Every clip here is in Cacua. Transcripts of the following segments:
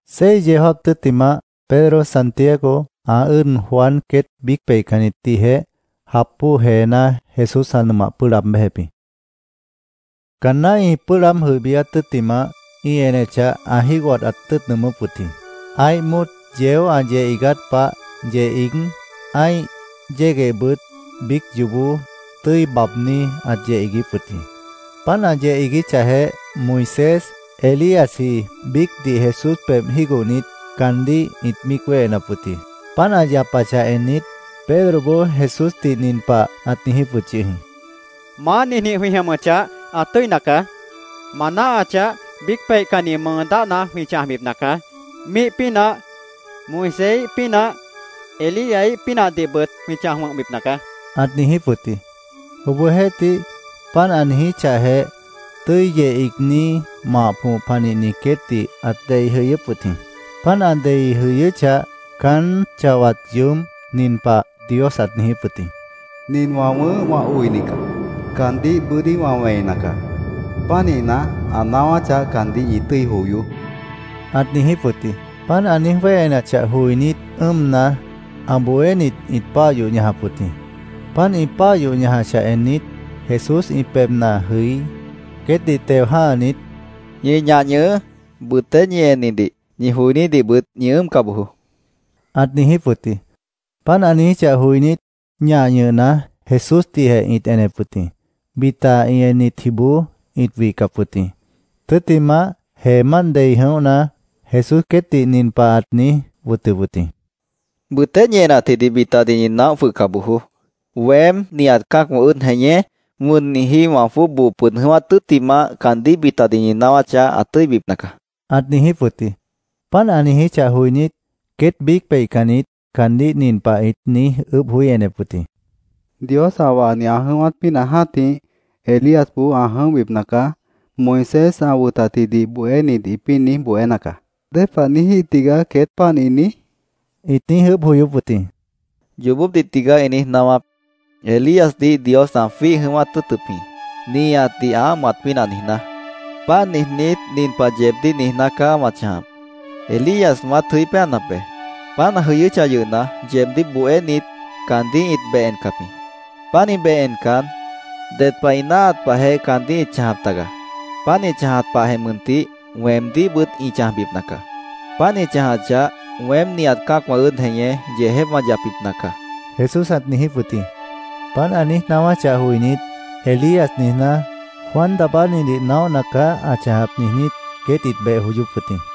Seis yeó jáap tʉ́ttimah, Pedro, Santiago, ã ʉ́ʉd Juan queét biíc peihcannitdihjeh jap bóo jeená Jesús ã nʉmah pʉ́ʉh laab béjep jĩ. Caanná ĩ pʉ́ʉh laáb jʉibíát tʉ́ttimah, ĩ enechah, ã jígohat ãt tʉ́ʉt nʉʉmʉ́p wʉt jĩ. Ã́ih móot yeó ã yeh iigát pah yeh iíg, ã́ih yéguehbʉt biíc yoobó tʉ́i baabní ãt yeh iiguíp wʉt jĩ. Páant ã yeh iiguíchahjeh, Moisés, Elíasji biícdih Jesús pebh jígohnit, caandíh ĩt míic wéhenap wʉt jĩ. Páant ã yapachah ennit, Pedroboó Jesúsdih nin pah ãt niijíp wʉt yʉh jĩ: —¡Maá, ninjĩh jwĩ jʉmʉchah, ã tʉ́ina caá! Ma náahachah, biíc peihcanni mʉʉ dáhna jwĩ chãjbipna caá. Míih pínah, Moiséíh pínah, Elíaíh pínahdihbʉt jwĩ chãj wʉ̃hbipna caá, ãt niijíp wʉt jĩ. Obohjeéhtih, páant ã niijíchahjeh, tʉ́i yeh iigní mah põh panihni queétdih ãt dei jʉyʉ́p wʉt jĩ. Páant ã dei jʉyʉ́chah, caán chawat yoób nin pah Dios ãt niijíp wʉt jĩ: “Nin wã wʉ̃ʉ́h wã oini caá. Caandíh bʉ́dí wã wẽina caá. Pánihna, ã naáwáchah, caandíh ñi tʉ́i joyoó”, ãt niijíp wʉt jĩ. Páant ã niíj wéhenachah joinít, ʉ́ʉmna, ã bohénit ĩt páah yoh ñajap wʉt jĩ. Páant ĩ páah yoh ñajachah ennit, Jesús ĩ pebhna jʉí, queétdih teo jã́hanit, —Ñi ñah ñʉhʉʉ́. Bʉtéh ñi ennidih, ñi joinídihbʉt ñi ʉ́ʉmca bojoó, ãt niijíp wʉt jĩ. Páant ã niijíchah joinít, ñah ñʉhna, Jesúsdihjeh ĩt enep wʉt jĩ. Bita ĩ ennitjiboó ĩt wihcap wʉt jĩ. Tʉ́ttimah, jeemánt dei jʉ̃óhna, Jesús queétdih nin pah ãt niíj wʉtʉp wʉt jĩ: —Bʉtéh ñi enatjidih bitadih ñi naóh jwʉhca bojoó. Weém, nihat cã́acwã ʉ́ʉd jeñé, wʉnniji wã jwʉ́ʉb boo pʉd jʉ̃ʉ́wát tʉ́ttimah, caandíh bitadih ñi naáwáchah, ã tʉ́ibipna caá, ãt niijíp wʉt jĩ. Páant ã niijíchah joinít, queét biíc peihcannit caandíh nin pah ĩt niíj ʉʉ́bh joí enep wʉt jĩ: —‘Dios ã wahni, ã jʉ̃ʉ́wát pínah jã́tih, Elíasboó ã jʉ̃óhbipna caá’, Moisés ã wʉtatjidih bohénit ĩpĩ́ niíj bohéna caá. ¿Dépah niíjíh tigaá queét páant ĩ niíj? ĩt niíj ʉʉ́bh joyóp wʉt jĩ. —Yoobópdih tigaá ĩ niíj naáwáp. Elíasdih Dios ã jwíih jʉ̃ʉ́wát tʉ́ʉtʉp jĩ, nihatdih ã ámohat pínah niijná. Páant niijnít, nin pah yeebdíh niijná caá wã chãjap. Elías wãát jʉí péanap be. Páant ã jʉyʉ́chah yʉhna, yeebdíh bohénit caandíh ĩt beh encap jĩ. Pánih beh encan, ded pah ĩ náahat pahjeh caandíh ĩt chãjap taga. Páant ĩ chãjat pahjeh mʉntih, weemdíhbʉt ĩ chãjbipna caá. Páant ĩ chãjachah, weém nihat cã́acwã ʉ́ʉd jeñé, yeejép wã yapbipna caá, Jesús ãt niijíp wʉt jĩ. Páant ã niíj naáwáchah joinít, “ ‘Elías’, niijná, Juan Daabánidih naóhna caá ã chãjap”, niijnít, queét ĩt beh joyóp wʉt jĩ.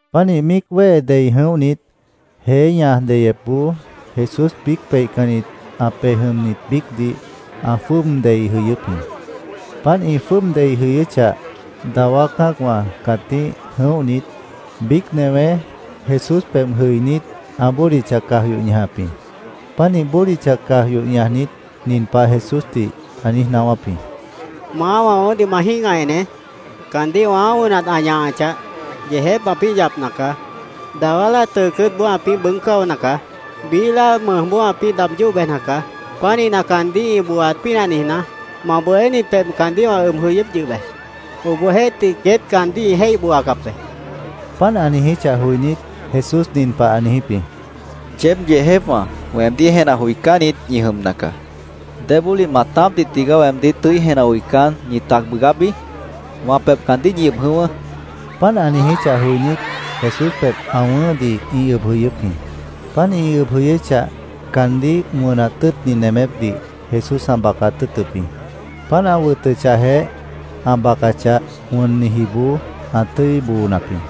Pánih míic wéhe dei jʉ̃óhnit, jeé ñaj deyepboó Jesús biíc peihcannit ã pej jʉmnit biícdih ã jwʉ́ʉb dei jʉyʉ́p jĩ. Páant ĩ jwʉ́ʉb dei jʉyʉ́chah, dawá cã́acwã cãtíh jʉ̃óhnit, biíc newé Jesús pebh jʉinít, ã bódicha caj yoh ñajap jĩ. Pánih bódicha caj yoh ñajnit, nin pah Jesúsdih ã niíj naáwáp jĩ: —Maá, wã wʉ̃ʉ́hdih ma jĩ́gah eneé. Caandíh wãá wʉnat ã ñahachah, yeejép ãpĩ́ yapna caá. Dawá láa tʉʉ cʉ́ʉtboó ãpĩ́ bʉʉ́g cáona caá. Biíh láa mʉjboó ãpĩ́ daab yóh bejna caá. Pánihna, caandíh ĩ booaat pínah niijná, ma bohénit pebh caandíh wã ʉb jʉyʉ́p yʉh be. Obohjeéhtih, queét caandíh ĩ jéih booacap be, ã niijíp jĩ. Páant ã niijíchah joinít, Jesús nin pah ã niijíp jĩ: —Yeéb yeejépwã weemdíh jenah joicánnit ñi jʉmna caá. ¿Débólih maatápdih tigaá weemdíh tʉ́i jenah joicán, ñi tac bʉʉgábi? Wã pebh caandíh ñi ʉb jʉ̃ʉ́wʉ́, ã niijíp jĩ. Páant ã niijíchah joinít, Jesús pebh ã wʉ̃ʉ́hdih ĩ ʉb jʉyʉ́p jĩ. Páant ĩ ʉb jʉyʉ́chah, caandíh wʉnat tʉ́ʉtni nemépdih Jesús ã bacat tʉ́ʉtʉp jĩ. Páant ã wʉtʉchahjeh, ã bacachah, wʉnnijiboó ã tʉ́i boonap jĩ.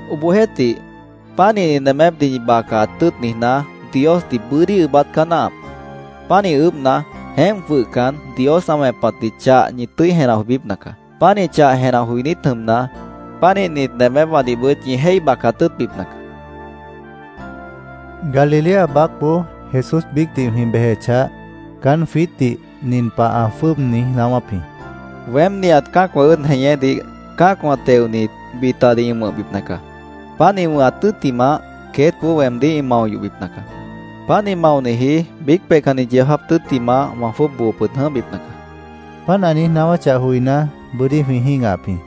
Obohjeéhtih, pánihni nemépdih ñi bacaat tʉ́ʉt niijná, Diosdih bʉ́dí ʉʉ́bát caá náahap. Pánih ʉʉ́bhna, jeémp jwʉhcan, Dios ã wẽpatdih chah ñi tʉ́i jenah joibípna caá. Pánih chah jenah joinít jʉmna, pánihnit nemépwãdihbʉt ñi jéih bacat tʉ́ʉtbipna caá, jwiítdih Jesús ã niijíp jĩ. Galilea baácboó Jesús biícdih jwĩ bejechah, caán jwiítdih nin pah ã jwʉ́ʉb niíj naáwáp jĩ: —Weém nihat cã́acwã ʉ́ʉd jeñédih cã́acwã teonit, bitadih ĩ wʉ̃hbipna caá. Páant ĩ wʉ̃hat tʉ́ttimah, queétboó weemdíh ĩ mao yohbipna caá. Páant ĩ maoniji biíc peihcanni yeó jáap tʉ́ttimah, wã jwʉ́ʉb boo pʉd jʉ̃óhbipna caá, ã niijíp jĩ. Páant ã niíj naáwáchah joiná, bʉ́dí jwĩ jĩ́gahap jĩ.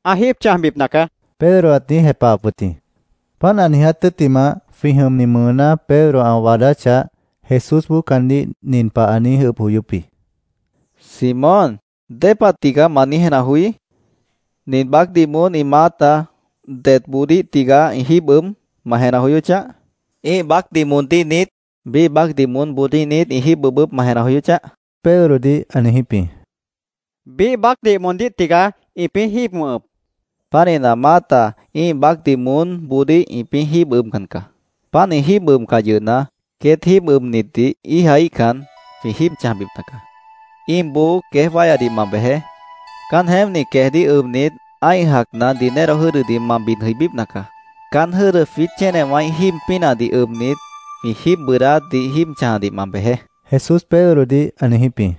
—Ã jíib chãjbipna caá, Pedro ãt niíj jepahap wʉt jĩ. Páant ã niiját tʉ́ttimah, jwĩ jʉmni mʉʉná Pedro ã waadáchah, Jesúsboó caandíh nin pah ã niíj ʉʉ́bh joyóp jĩ: —¿Simón, dépah tigaá ma niíj jenah joí? ¿Nin baácdih moón ĩ maáta detboodíh tigaá ĩ jíib ʉb, ma jenah joyóchah? ¿Ĩ́ih baácdih moondíh niít? ¿Biíh baácdih moónboodíh niít ĩ jíib ʉbʉp, ma jenah joyóchah? Pedrodih ã niijíp jĩ. —Biíh baácdih moondíh tigaá ĩpĩ́ jíib ʉbʉp, Pedro ã niíj jepahap jĩ. —Pánihna, maáta ĩ́ih baácdih moónboodíh ĩpĩ́ jíib ʉbcan caá. Páant ĩ jíib ʉbcah yʉhna, queét jíib ʉbnitdih íijaíhcan, jwĩ jíib chãjbipna caá. Íimboó queéj wáyadih ma bejeé. Caán jeémpni queejdíh ʉbnit, ã́ih jacna dinero jʉ́dʉdih ma bid jʉibípna caá. Caán jʉ́dʉ jwiít chénewãíh jíib pínahdih ʉbnit, jwĩ jíib bʉʉdáátdih jíib chãjadih ma bejeé, Jesús Pedrodih ã niijíp jĩ.